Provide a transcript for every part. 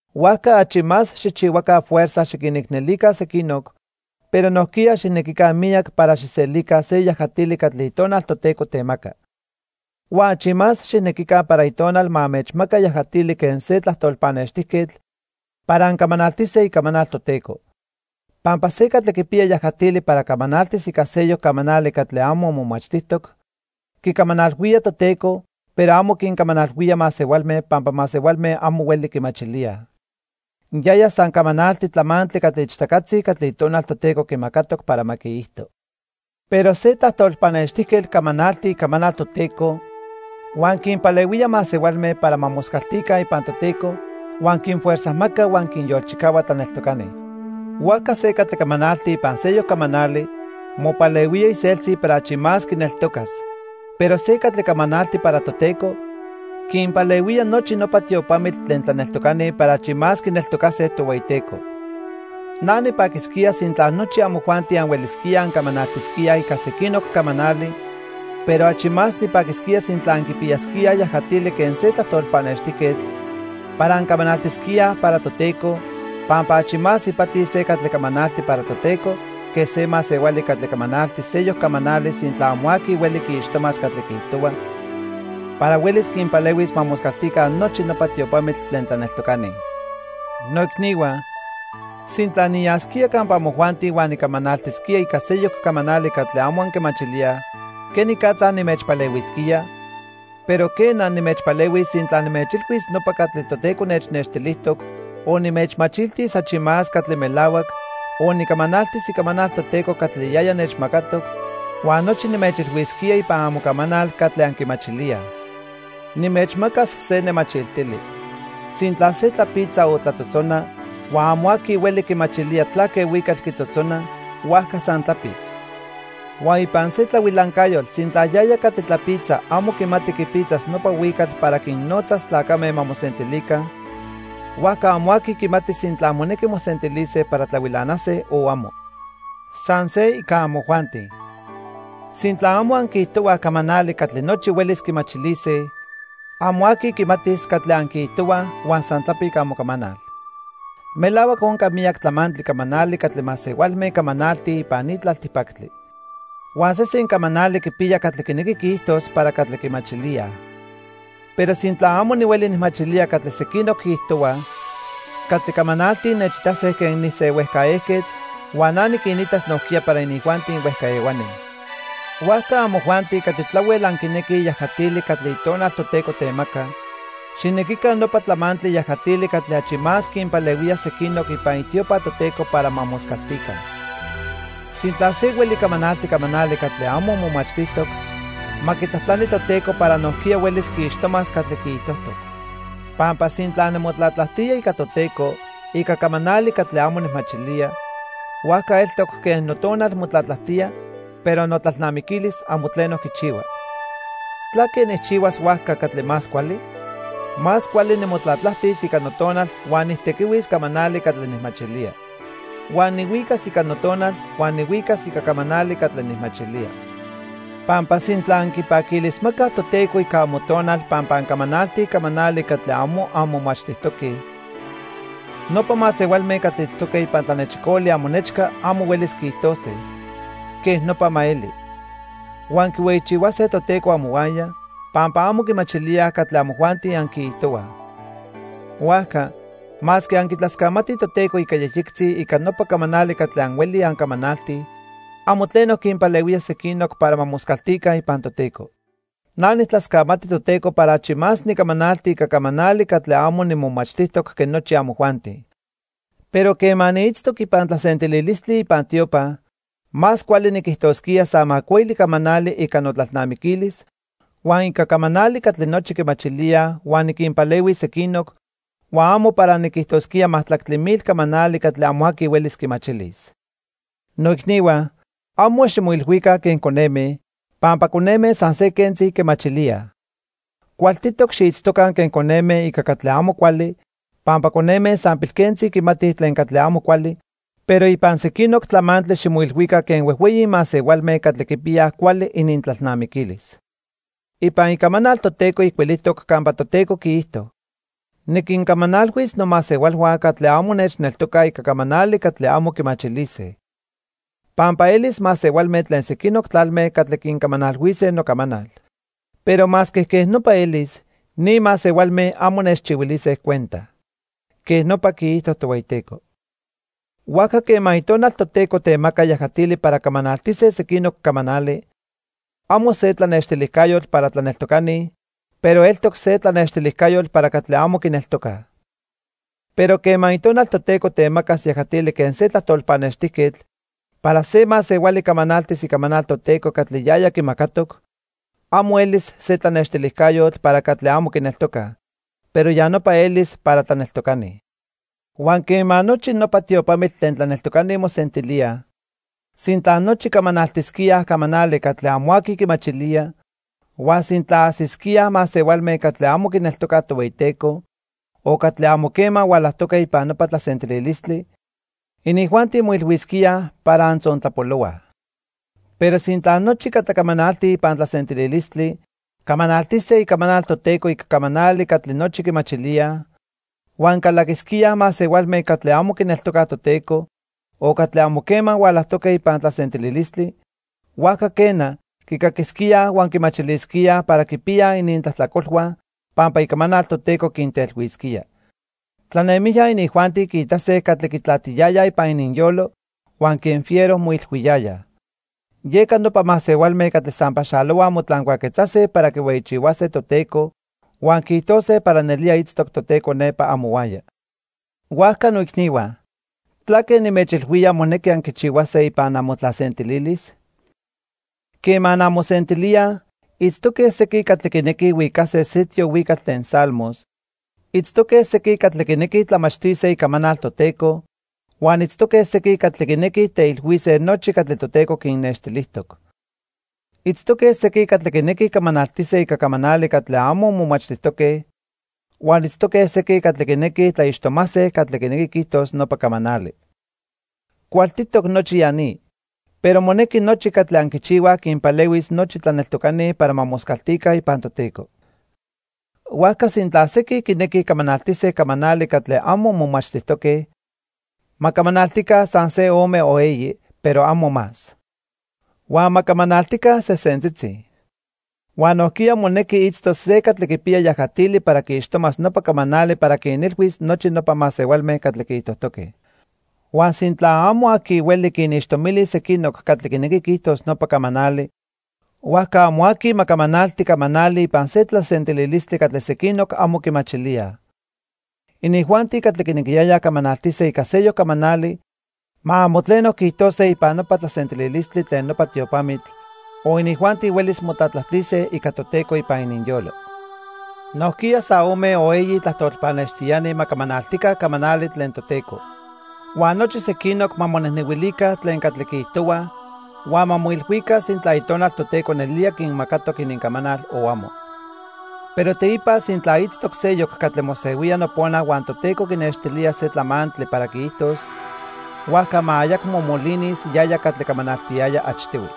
Huajca achi más xijchihuaca fuerza xiquinicnelica sequinoc, pero nojquiya xijnequica miyac para xijselica se yajatili catli Itonal Toteco temaca. Huan achi más xijnequica para Itonal ma anmechmaca yajatili quen se tlajtol pannextijquetl para ancamanaltise icamanal Toteco. Pampa se catli quipiya yajatili para camanaltis ica seyoc camanali catli amo momachtijtoc, quicamanalhuía Toteco, pero amo quincamanalhuía masehualme pampa masehualme amo hueli quimachilíaj. Yaya san camanalti tlamantli catli ichtacatzi catli Itonal Toteco quimacatoc para ma quiijto. Pero se tlajtol pannextijquetl camanalti icamanal Toteco huan quinpalehuía masehualme para ma moscaltica ipan Toteco, huan quinfuerzajmaca huan quinyolchicahua tlaneltocani. Huajca se catli camanalti ipan seyoc camanali, mopalehuía iseltzi para achi más quineltocas, pero se catli camanalti para Toteco, quinpalehuía nochi nopa tiopamitl tlen tlaneltocani para achi más quineltocase Tohueyiteco. Na nipaquisquía sintla nochi amojuanti anhuelisquíaj ancamanaltisquíaj ica sequinoc camanali, pero achi más nipaquisquía sintla anquipiyasquíaj yajatili quen se tlajtol pannextijquetl para ancamanaltisquíaj para Toteco, pampa achi más ipati se catli camanalti para Toteco que se masehuali catli camanalti seyoc camanali sintla amo aqui hueli quiixtomas catli quiijtohua para huelis quinpalehuis ma moscaltica nochi nopa tiopamitl tlen tlaneltocani. Noicnihua, sintla niyasquía campa amojuanti huan nicamanaltisquía ica seyoc camanali catli amo anquimachilíaj, ¿quenicatza nimechpalehuisquía? Pero quena, nimechpalehuis sintla nimechilhuis nopa catli Toteco nechnextilijtoc, o nimechmachiltis achi más catli melahuac, o nicamanaltis icamanal Toteco catli yaya nechmacatoc, huan nochi nimechilhuisquía ipan amocamanal catli anquimachilíaj. Nimechmacas se nemachiltili. Sintla se tlapitza o tlatzotzona, huan amo aqui hueli quimachilía tlaque huicatl quitzotzona, huajca san tlapic. Huan ipan se tlahuilancayotl sintla yaya catli tlapitza amo quimati quipitzas nopa huicatl para quinnotzas tlacame ma mosentilica, huajca amo aqui quimatis sintla monequi mosentilise para tlahuilanase o amo. San se ica amojuanti. Sintla amo anquiijtohuaj camanali catli nochi huelis quimachilise, amo aqui quimatis catli anquiijtohuaj huan san tlapic amocamanal. Melahuac onca miyac tlamantli camanali catli masehualme camanaltij ipan ni tlaltipactli. Huan sesen camanali quipiya catli quinequi quiijtos para catli quimachilíaj. Pero sintla amo nihueli nijmachilía catli sequinoc quiijtohuaj, catli camanaltij nechitase quen nise huejca ejquetl huan na niquinitas nojquiya para inijuanti huejca ehuani. Huajca amojuanti catli tlahuel anquinequij yajatili catli Itonal Toteco temaca, xijnequica nopa tlamantli yajatili catli achi más quinpalehuía sequinoc ipan itiopa Toteco para ma moscaltica. Sintla se hueli camanalti camanali catli amo momachtijtoc, ma quitlajtlani Toteco para nojquiya huelis quiixtomas catli quiijtojtoc. Pampa sintla nimotlatlajtía ica Toteco ica camanali catli amo nijmachilía, huajca eltoc quen notonal motlatlajtía pero notlalnamiquilis amo tleno quichihua. ¿Tlaque nijchihuas huajca catli más cuali? Más cuali nimotlatlajtis ica notonal huan nijtequihuis camanali catli nijmachilía. Huan nihuicas ica notonal huan nihuicas ica camanali catli nijmachilía. Pampa sintla anquipaquilismacaj Toteco ica amotonal pampa ancamanaltij camanali catli amo anmomachtijtoque, nopa masehualme catli itztoque ipan tlanechicoli amonechca amo huelis quiijtose: "Quej nopa ma eli", huan quihueyichihuase Toteco amohuaya, pampa amo quimachilíaj catli amojuanti anquiijtohuaj. Huajca, masque anquitlascamatij Toteco ica yejyectzi ica nopa camanali catli anhuelij ancamanaltij, amo tleno quinpalehuía sequinoc para ma moscaltica ipan Toteco. Na nijtlascamati Toteco para achi más nicamanalti ica camanali catli amo nimomachtijtoc que nochi amojuanti. Pero quema niitztoc ipan tlasentililistli ipan tiopa, más cuali niquijtosquía san macuili camanali ica notlalnamiquilis huan ica camanali catli nochi quimachilíaj huan niquinpalehuis sequinoc, huan amo para niquijtosquía majtlactli mil camanali catli amo aqui huelis quimachilis. Noicnihua, amo ximoilhuica quen coneme, pampa coneme san se quentzi quimachilíaj. Cualtitoc xiitztoca quen coneme ica catli amo cuali, pampa coneme san pilquentzi quimatij tlen catli amo cuali, pero ipan sequinoc tlamantli ximoilhuica quen huejhueyi masehualme catli quipiyaj cuali inintlalnamiquilis. Ipan Icamanal Toteco ijcuilijtoc campa Toteco quiijto: "Niquincamanalhuis nomasehualhua catli amo nechneltocaj ica camanali catli amo quimachilise. Pampa elis masehualme tlen sequinoc tlalme catli quincamanalhuise nocamanal. Pero masque quej nopa elis, ni masehualme amo nechchihuilise cuenta." Quej nopa quiijto Tohueyiteco. Huajca quema Itonal Toteco temaca yajatili para camanaltise sequinoc camanali, amo se tlanextilijcayotl para tlaneltocani, pero eltoc se tlanextilijcayotl para catli amo quineltocaj. Pero quema Itonal Toteco temacas yajatili quen se tlajtol pannextijquetl para se masehuali camanaltis icamanal Toteco catli yaya quimacatoc, amo elis se tlanextilijcayotl para catli amo quineltocaj, pero ya nopa elis para tlaneltocani. Huan quema nochi nopa tiopamitl tlen tlaneltocani mosentilíaj, sintla nochi camanaltisquíaj camanali catli amo aqui quimachilía, huan sintla ajsisquíaj masehualme catli amo quineltocaj Tohueyiteco, o catli amo quema hualajtoque ipan nopa tlasentililistli, inijuanti moilhuisquíaj para antzontlapolohuaj. Pero sintla nochi catli camanaltij ipan tlasentililistli, camanaltise icamanal Toteco ica camanali catli nochi quimachilíaj, huan calaquisquíaj masehualme catli amo quineltocaj Toteco, o catli amo quema hualajtoque ipan tlasentililistli, huajca quena, quicaquisquíaj huan quimachilisquíaj para quipiyaj inintlajtlacolhua pampa icamanal Toteco quintelhuisquía. Tlanemijya inijuanti quiitase catli quitlatiyayaj ipan ininyolo huan quen fiero moilhuiyayaj. Yeca nopa masehualme catli san paxalohuaj motlancuaquetzase para quihueyichihuase Toteco huan quiijtose para nelía itztoc Toteco nepa amohuaya. Huajca noicnihua, ¿tlaque nimechilhuía monequi anquichihuase ipan amotlasentililis? Quema anmosentilíaj, itztoque sequin catli quinequij huicase se tiohuicatl tlen Salmos, itztoque sequin catli quinequij tlamachtise Icamanal Toteco, huan itztoque sequin catli quinequij teilhuise nochi catli Toteco quinnextilijtoc. Itztoque sequin catli quinequij camanaltise ica camanali catli amo momachtijtoque, huan itztoque sequin catli quinequij tlaixtomase catli quinequi quiijtos nopa camanali. Cualtitoc nochi ya ni, pero monequi nochi catli anquichihuaj quinpalehuis nochi tlaneltocani para ma moscaltica ipan Toteco. Huajca sintla sequin quinequij camanaltise camanali catli amo momachtijtoque, ma camanaltica san ome o eyi, pero amo más. Huan ma camanaltica sesentzitzi, huan nojquiya monequi itztos se catli quipiya yajatili para quiixtomas nopa camanali para quinilhuis nochi nopa masehualme catli quiijtojtoque. Huan sintla amo aqui hueli quinixtomilis sequinoc catli quinequi quiijtos nopa camanali, huajca amo aqui ma camanalti camanali ipan se tlasentililistli catli sequinoc amo quimachilíaj. Inijuanti catli quinequiyayaj camanaltise ica seyoc camanali ma amo tleno quiijtose ipan nopa tlasentililistli tlen nopa tiopamitl, o inijuanti huelis motlatlajtise ica Toteco ipan ininyolo. Nojquiya san ome o eyi tlajtol pannextiani ma camanaltica camanali tlen Toteco. Huan nochi sequinoc ma monejnehuilica tlen catli quiijtohuaj huan ma moilhuica sintla Itonal Toteco nelía quinmacatoc inincamanal o amo. Pero teipa sintla itztoc seyoc catli mosehuía nopona huan Toteco quinextilía se tlamantli para quiijtos, huajca ma ayacmo molinis yaya catli camanaltiyaya achtihui.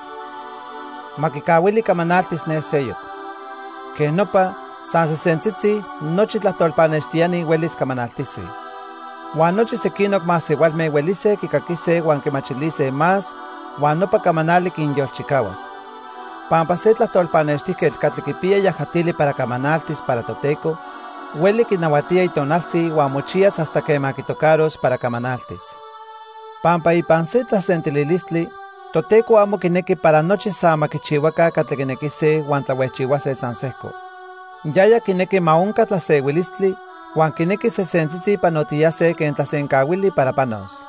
Ma quicahuili camanaltis ne seyoc. Quej nopa, san sesentzitzi, nochi tlajtol pannextiani huelis camanaltise. Huan nochi sequinoc masehualme huelise quicaquise huan quimachilise más huan nopa camanali quinyolchicahuas. Pampa se tlajtol pannextijquetl catli quipiya yajatili para camanaltis para Toteco, hueli quinahuatía itonaltzi huan mochiyas hasta quema quitocaros para camanaltis. Pampa ipan se tlasentililistli, Toteco amo quinequi para nochi san ma quichihuaca catli quinequise huan tlahuejchihuase san sejco. Yaya quinequi ma onca tlasehuilistli huan quinequi sesentzitzi panotiyase quen tlasencahuili para panos.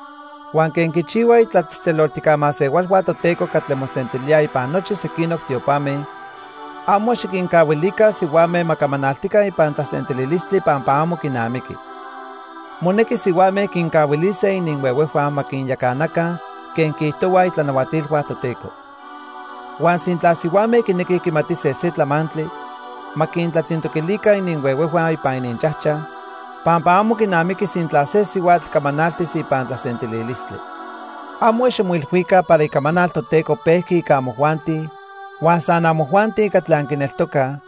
Huan quen quichihuaj itlatzejtzeloltijca masehualhua Toteco catli mosentilíaj ipan nochi sequinoc tiopame, amo xiquincahuilica sihuame ma camanaltica ipan tlasentililistli pampa amo quinamiqui. Monequi sihuame quincahuilise ininhuehuejhua ma quinyacanaca quen quiijtohuaj itlanahuatilhua Toteco. Huan sintla sihuame quinequij quimatise se tlamantli, ma quintlatzintoquilica ininhuehuejhua ipan ininchajchaj, pampa amo quinamiqui sintla se sihuatl camanaltis ipan tlasentililistli. Amo ximoilhuica para Icamanal Toteco pejqui ica amojuanti huan san amojuanti catli anquineltocaj,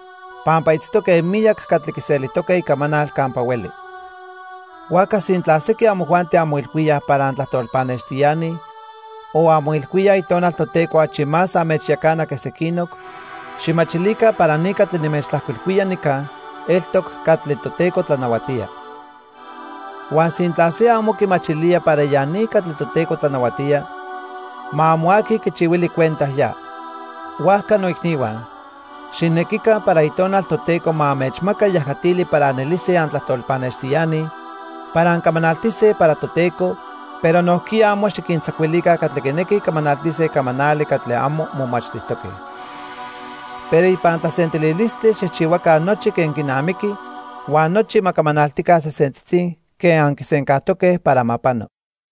pampa itztoque miyac catli quiselijtoque icamanal campa hueli. Huajca sintla sequin amojuanti anmoilhuíaj para antlajtol pannextiani, o anmoilhuíaj Itonal Toteco achi más anmechyacana que sequinoc, xijmachilica para ni catli nimechtlajcuilhuía nica eltoc catli Toteco tlanahuatía. Huan sintla se amo quimachilía para ya ni catli Toteco tlanahuatía, ma amo aqui quichihuili cuenta ya. Huajca noicnihua, xijnequica para Itonal Toteco ma anmechmaca yajatili para anelise antlajtol pannextiani para ancamanaltise para Toteco, pero nojquiya amo xiquintzacuilica catli quinequij camanaltise camanali catli amo momachtijtoque. Pero ipan tlasentililistli xijchihuaca nochi quen quinamiqui huan nochi ma camanaltica sesentzitzi quen anquisencajtoque para ma pano.